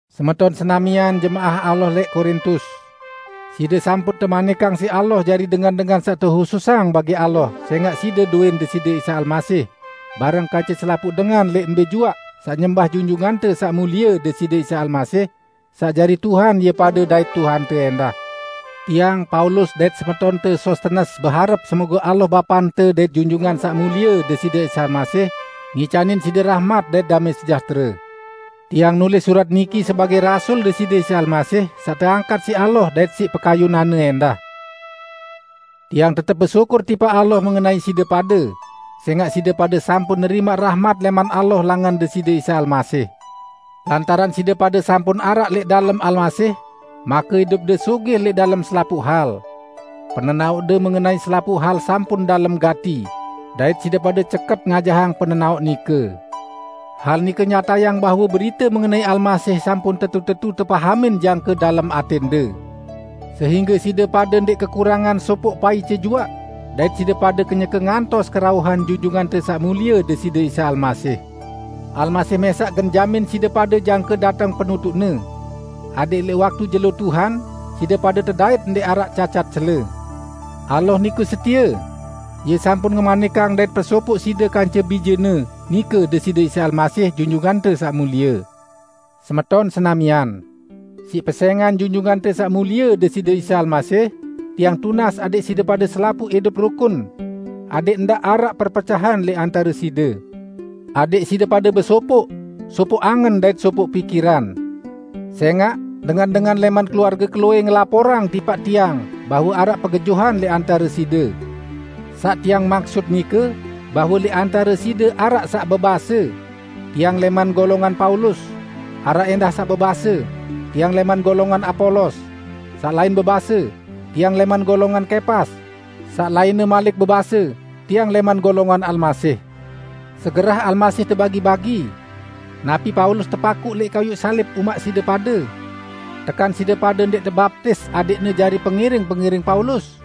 Semeton senamian jemaah Allah lẽq Korintus! Side sampun temanikang siq Allah jari dengan-dengan saq tehususang bagi Allah sẽngaq side dowẽn Deside Isa Almasih, bareng kance selapuq dengan lẽq embẽ juaq saq nyembah Junjungante Saq Mulie Deside Isa Almasih, saq jari Tuhan ie pade dait Tuhante ẽndah. Tiang, Paulus, dait semetonte Sostenes, beharep semoge Allah Bapante dait Junjungan Saq Mulie Deside Isa Almasih ngicanin side rahmat dait damẽ sejahtere. Tiang nulis surat niki sebagẽ rasul Deside Isa Almasih, saq teangkat siq Allah dait siq pekayunan-Ne ẽndah. Tiang tetep besyukur tipaq Allah mengenai side pade, sẽngaq side pade sampun nerimaq rahmat lẽman Allah langan Deside Isa Almasih. Lantaran side pade sampun araq lẽq dalem Almasih, make idupde sugih lẽq dalem selapuq hal. Penenaoqde mengenai selapuq hal sampun dalem gati, dait side pade ceket ngajahang penenaoq nike. Hal nike nyatayang bahwe berite mengenai Almasih sampun tetu-tetu tepahamin jangke dalem atẽnde, sehingge side pade ndẽq kekurangan sopoq paice juaq, dait side pade kenyeke ngantos kerauhan Junjungante Saq Mulie Deside Isa Almasih. Almasih mẽsaq gen jamin side pade jangke dateng penutuqne; adẽq lẽq waktu jelo Tuhan, side pade tedait ndẽq araq cacat cele. Allah nike setie. Ie sampun ngemanikang dait pesopoq side kance Bije-Ne, nike Deside Isa Almasih, Junjungante Saq Mulie. Semeton senamian! Siq pesẽngan Junjungante Saq Mulie Deside Isa Almasih, tiang tunas adẽq side pade selapuq idup rukun; adẽq ndaq araq perpecahan lẽq antare side. Adẽq side pade besopoq, sopoq angen dait sopoq pikiran. Sẽngaq, dengan-dengan lẽman keluarge Kloe ngelaporang tipaq tiang bahwe araq pegejuhan lẽq antare side. Saq tiang maksut nike, bahwe lẽq antare side araq saq bebase, "Tiang lẽman golongan Paulus", araq ẽndah saq bebase, "Tiang lẽman golongan Apolos". Saq lain bebase, "Tiang lẽman golongan Kepas". Saq lainne malik bebase, "Tiang lẽman golongan Almasih." Segerah Almasih tebagi-bagi? Napi Paulus tepakuq lẽq kayuq salib umaq side pade? Tekan side pade ndẽq tebaptis adẽqne jari pengiring-pengiring Paulus?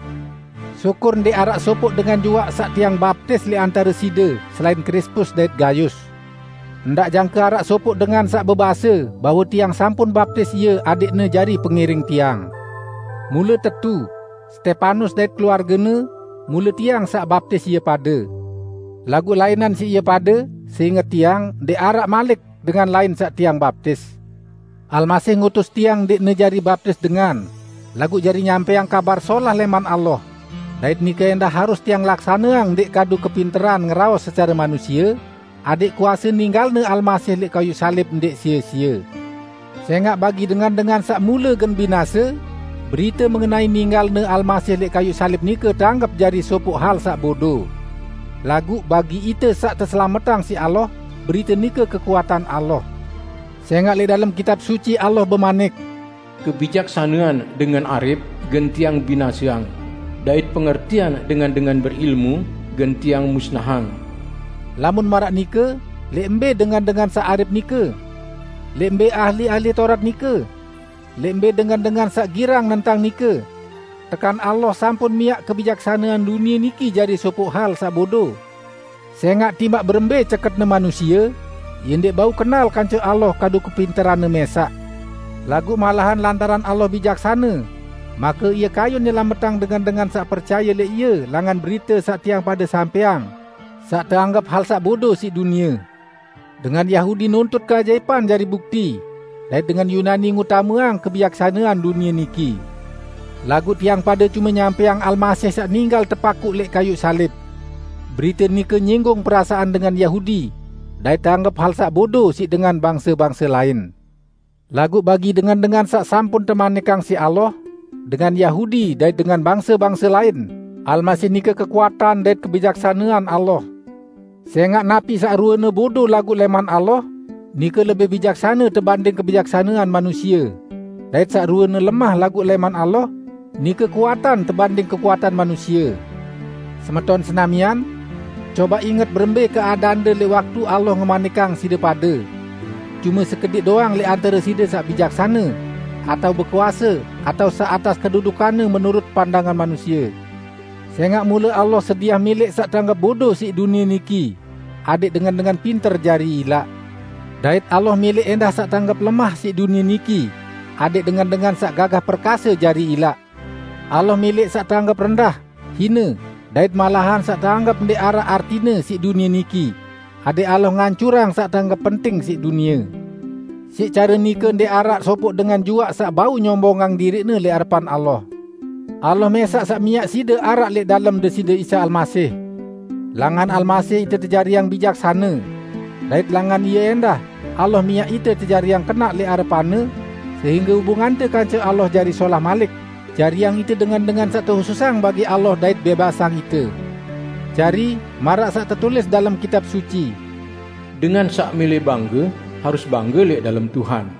Syukur ndẽq araq sopoq dengan juaq saq tiang baptis lẽq antare side, selain Krispus dait Gayus. Ndaq jangke araq sopoq dengan saq bebase bahwe tiang sampun baptis ie adẽqne jari pengiring tiang. ( Mule tetu, Stepanus dait keluargene, mule tiang saq baptis ie pade. Laguq lainan siq ie pade, seinget tiang, ndẽq araq malik dengan lain saq tiang baptis.) Almasih ngutus tiang ndẽqne jari baptis dengan, laguq jari nyampẽang Kabar Solah lẽman Allah; dait nike ẽndah harus tiang laksaneang ndẽq kadu kepinteran ngeraos secare manusie, adẽq kuase ninggal-Ne Almasih lẽq kayuq salib ndẽq sie-sie. Sẽngaq bagi dengan-dengan saq mule gen binase, berite mengenai ninggal-Ne Almasih lẽq kayuq salib nike teanggep jari sopoq hal saq bodo. Laguq, bagi ite saq teselametang siq Allah, berite nike kekuatan Allah. Sẽngaq lẽq dalem Kitab Suci, Allah bemanik, "Kebijaksanean dengan arip gen Tiang binaseang, dait pengertian dengan-dengan berilmu gen Tiang musnahang." Lamun maraq nike, lẽq mbẽ dengan-dengan saq arip nike? Lẽq mbẽ ahli-ahli Taurat nike? Lẽq mbẽ dengan-dengan saq girang nentang nike? Tekan Allah sampun miaq kebijaksanean dunie niki jari sopoq hal saq bodo? Sẽngaq timaq berembẽ ceketne manusie, ie ndẽq bau kenal kance Allah kadu kepinteranne mẽsaq. Laguq malahan lantaran Allah bijaksane, make Ie kayun nyelametang dengan-dengan saq percaye lẽq Ie langan berite saq tiang pade sampẽang, saq teanggep hal saq bodo siq dunie. Dengan Yahudi nuntut keajaipan jari bukti, dait dengan Yunani ngutameang kebijaksanean dunie niki. Laguq tiang pade cume nyampẽang Almasih saq ninggal tepakuq lẽq kayuq salib. Berite nike nyinggung perasaan dengan Yahudi, dait teanggep hal saq bodo siq dengan bangse-bangse lain. Laguq bagi dengan-dengan saq sampun temanikang siq Allah -- dengan Yahudi dait dengan bangse-bangse lain -- Almasih nike kekuatan dait kebijaksanean Allah. Sẽngaq napi saq ruene bodo laguq lẽman Allah, nike lebih bijaksane tebanding kebijaksanean manusie; dait saq ruene lemah laguq lẽman Allah, nike kuatan tebanding kekuatan manusie. Semeton senamian! Cobaq inget berembẽ keadaande lẽq waktu Allah ngemanikang side pade. Cume sekediq doang lẽq antare side saq bijaksane, atao bekuase atao saq atas kedudukanne menurut pandangan manusie. Sẽngaq mule Allah sediah milẽq saq teanggep bodo siq dunie niki, adẽq dengan-dengan pinter jari ilaq. Dait Allah milẽq ẽndah saq teanggep lemah siq dunie niki, adẽq dengan-dengan saq gagah perkase jari ilaq. Allah milẽq saq teanggep rendah, hine, dait malahan saq teanggep ndẽq araq artine siq dunie niki, adẽq Allah ngancurang saq teanggep penting siq dunie. Siq care nike ndẽq araq sopoq dengan juaq saq bau nyombongang diriqne lẽq arepan Allah. Allah mẽsaq saq miaq side araq lẽq dalem Deside Isa Almasih. Langan Almasih ite tejariang bijaksane. Dait langan Ie ẽndah Allah miaq ite tejariang kenaq lẽq arepan-Ne sehingge hubungante kance Allah jari solah malik, jariang ite dengan-dengan saq tehususang bagi Allah dait bẽbasang ite. Jari, maraq saq tetulis dalem Kitab Suci, "Dengan saq mẽlẽ bangge, harus bangge lẽq dalem Tuhan."